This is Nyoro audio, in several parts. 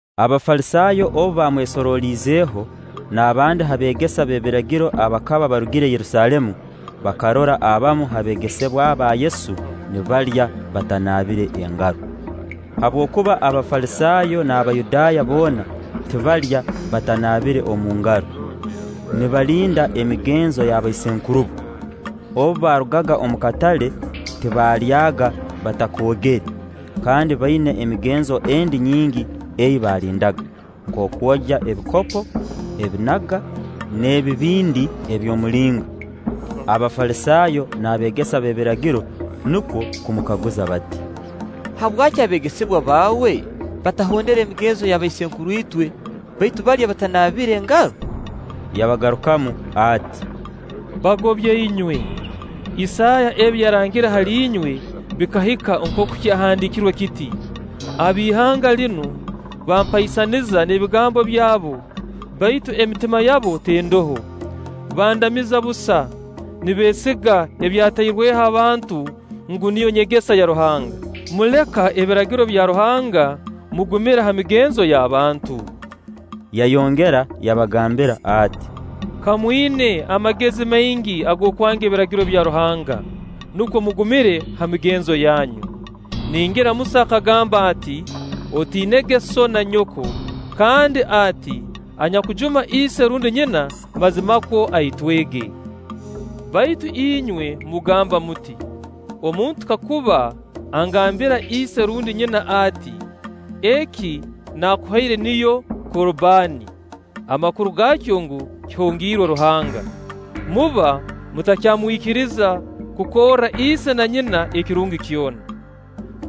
Abafalisaayo obu baamwesoroliizeho n'abandi ha beegesa b'ebiragiro abakaba barugire Yerusaalemu, bakarora abamu ha beegesebwa ba Yesu nibalya batanaabire engaro. (Habwokuba Abafalisaayo n'Abayudaaya boona tibalya batanaabire omu ngaro, nibalinda emigenzo y'abaisenkurubo; obu baarugaga omu katale, tibalyaaga batakoogere; kandi baina emigenzo endi nyingi ei baalindaga: Nk'okwogya ebikopo, ebinaga, n'ebibindi eby'omulinga.) Abafalisaayo n'abeegesa b'ebiragiro nukwo kumukaguza bati: “Habwaki abeegesebwa baawe batahondera emigenzo y'abaisenkuruitwe, baitu balya batanaabire engaro?” Yabagarukamu ati: “Bagobya inywe, Isaaya ebi yarangire hali inywe bikahika nkooku kyahandiikirwe kiti: ‘Ab'ihanga linu bampaisaniza n'ebigambo byabo, baitu emitima yabo tendoho; bandamiza busa, nibeegesa ebyatairweho abantu ngu niyo nyegesa ya Ruhanga.’ “Muleka Ebiragiro bya Ruhanga, mugumira ha migenzo y'abantu.” Yayongera yabagambira ati: “Ka mwina amagezi maingi ag'okwanga Ebiragiro bya Ruhanga, nukwo mugumire ha migenzo yanyu! Ningira Musa akagamba ati: ‘Otiinege sso na nyoko;’ kandi ati: ‘Anyakujuma ise rundi nyina, mazimakwo aitwege’; baitu inywe mugamba muti: ‘Omuntu kakuba agambira ise rundi nyina ati: Eki naakuhaire niyo Korbaani’ (amakuru gaakyo ngu: kihongiirwe Ruhanga) muba mutakyamwikiriza kukorra ise na nyina ekirungi kyona.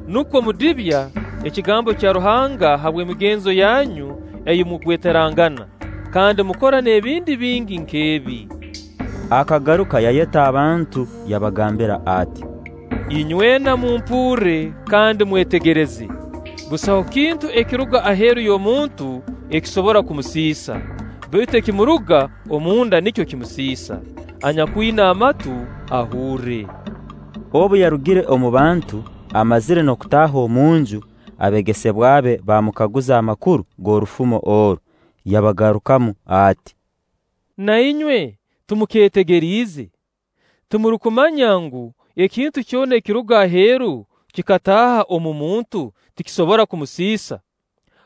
Nukwo mudibya ekigambo kya Ruhanga habw'emigenzo yanyu ei mugweterangana. Kandi mukora n'ebindi bingi nk'ebi.” Akagaruka yayeta abantu, yabagambira ati: “Inywena mumpurre kandi mwetegereze; busaho kintu ekiruga aheeru y'omuntu ekisobora kumusiisa; baitu ekimuruga omu nda nikyo kimusiisa. Anyakwina amatu, ahurre.” Obu yarugire omu bantu, amazire n'okutaaha omu nju, abeegesebwa be baamukaguza amakuru g'orufumo oru. Yabagarukamu ati: “Na inywe timukeetegeriize? Timurukumanya ngu, ekintu kyona ekiruga aheeru kikataaha omu muntu tikisobora kumusiisa?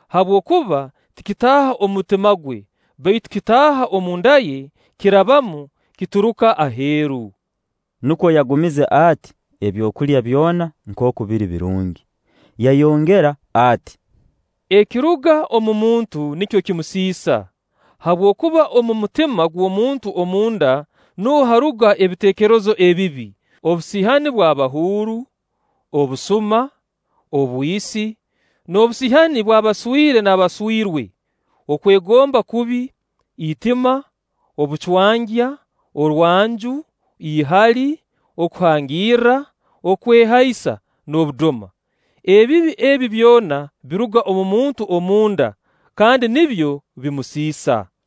Habwokuba tikitaaha omu mutima gwe, baitu kitaaha omu nda ye, kirabamu, kituruka aheeru.” (Nukwo yagumize ati ebyokulya byona nkooku biri birungi.) Yayongera ati: “Ekiruga omu muntu nikyo kimusiisa; habwokuba omu mutima gw'omuntu omunda nuho haaruga ebiteekerezo ebibi, obusiihani bw'abahuuru, obusuma, obwisi, n'obusiihani bw'abaswire n'abaswirwe, okwegomba kubi, itima, obucwangya, orwanju, ihali, okuhangirra, okwehaisa, n'obudoma. Ebibi ebi byona biruga omu muntu omu nda, kandi nibyo bimusiisa.”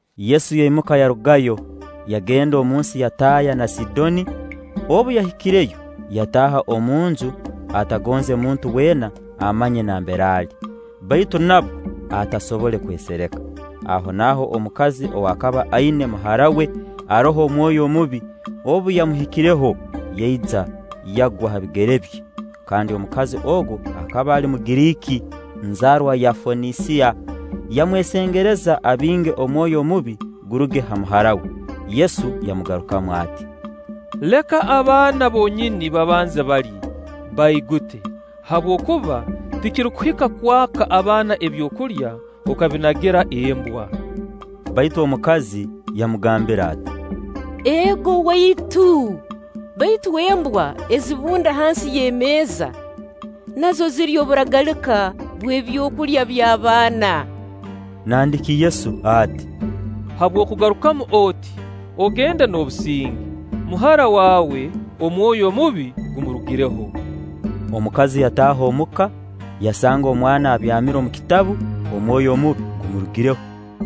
Yesu yaimuka yarugayo, yagenda omunsi ya Taya na Sidooni. Obu yahikireyo, yataaha omu nju, atagonze muntu weena amanye nambere ali; baitu nabwo atasobole kwesereka. Ahonaaho omukazi ow'akaba aina muhara we aroho omwoyo omubi, obu yamuhuliireho, yaija, yagwa ha bigere bye. Kandi omukazi ogu akaba ali Mugiriiki, nzaarwa ya Fonisiya. Yamwesengereza abinge omwoyo omubi guruge ha muhara we. Yesu yamugarukamu ati: “Leka abaana bonyini babanze balye, baigute, habwokuba tikirukuhika kwaka abaana ebyokulya, okabinagira embwa.” Baitu omukazi yamugambira ati: “Ego, Waitu, baitu embwa ezibunda hansi y'emeeza nazo zirya oburagalika bw'ebyokulya by'abaana.” Nandiki Yesu ati: “Habw'okugarukamu oti, ogende n'obusinge; muhara waawe, omwoyo omubi gumurugireho.” Omukazi yataaha omuka, yasanga omwana abyamire omu kitabu, omwoyo omubi gumurugireho.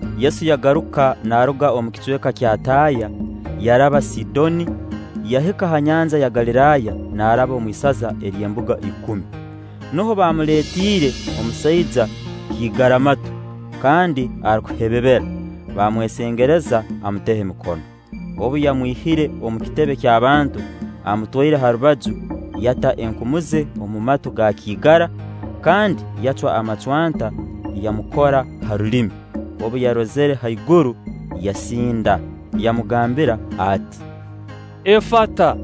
Yesu yagaruka naaruga omu kicweka kya Taya, yaraba Sidooni, yahika ha nyanja ya Galiraaya naaraba omu isaza ly'Embuga Ikumi. Nuho baamuleetiire omusaija kiigaramatu kandi arukuhebebera; baamwesengereza amuteho emikono. Obu yamwihire omu kitebe ky'abantu, amutwaire ha rubaju, yata enkumu ze omu matu ga kiigara, kandi yacwa amacwanta, yamukora ha rulimi; obu yarozire haiguru, yasinda, yamugambira ati: “Efata,”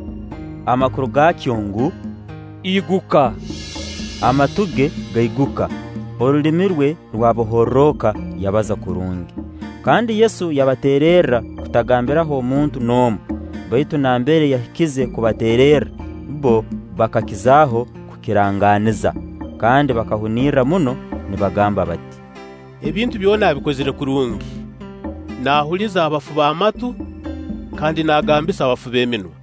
amakuru gaakyo ngu: “Iguka.” Amatu ge gaiguka, orulimi rwe rwabohorroka, yabaza kurungi. kandi Yesu yabateererra kutagambiraho muntu n'omu; baitu nambere yahikize kubateererra, bbo bakakizaaho kukirangaaniza. Kandi bakahunirra muno nibagamba bati: “Ebintu byona abikozire kurungi, naahuliza abafu b'amatu kandi naagambisa abafu b'eminwa.”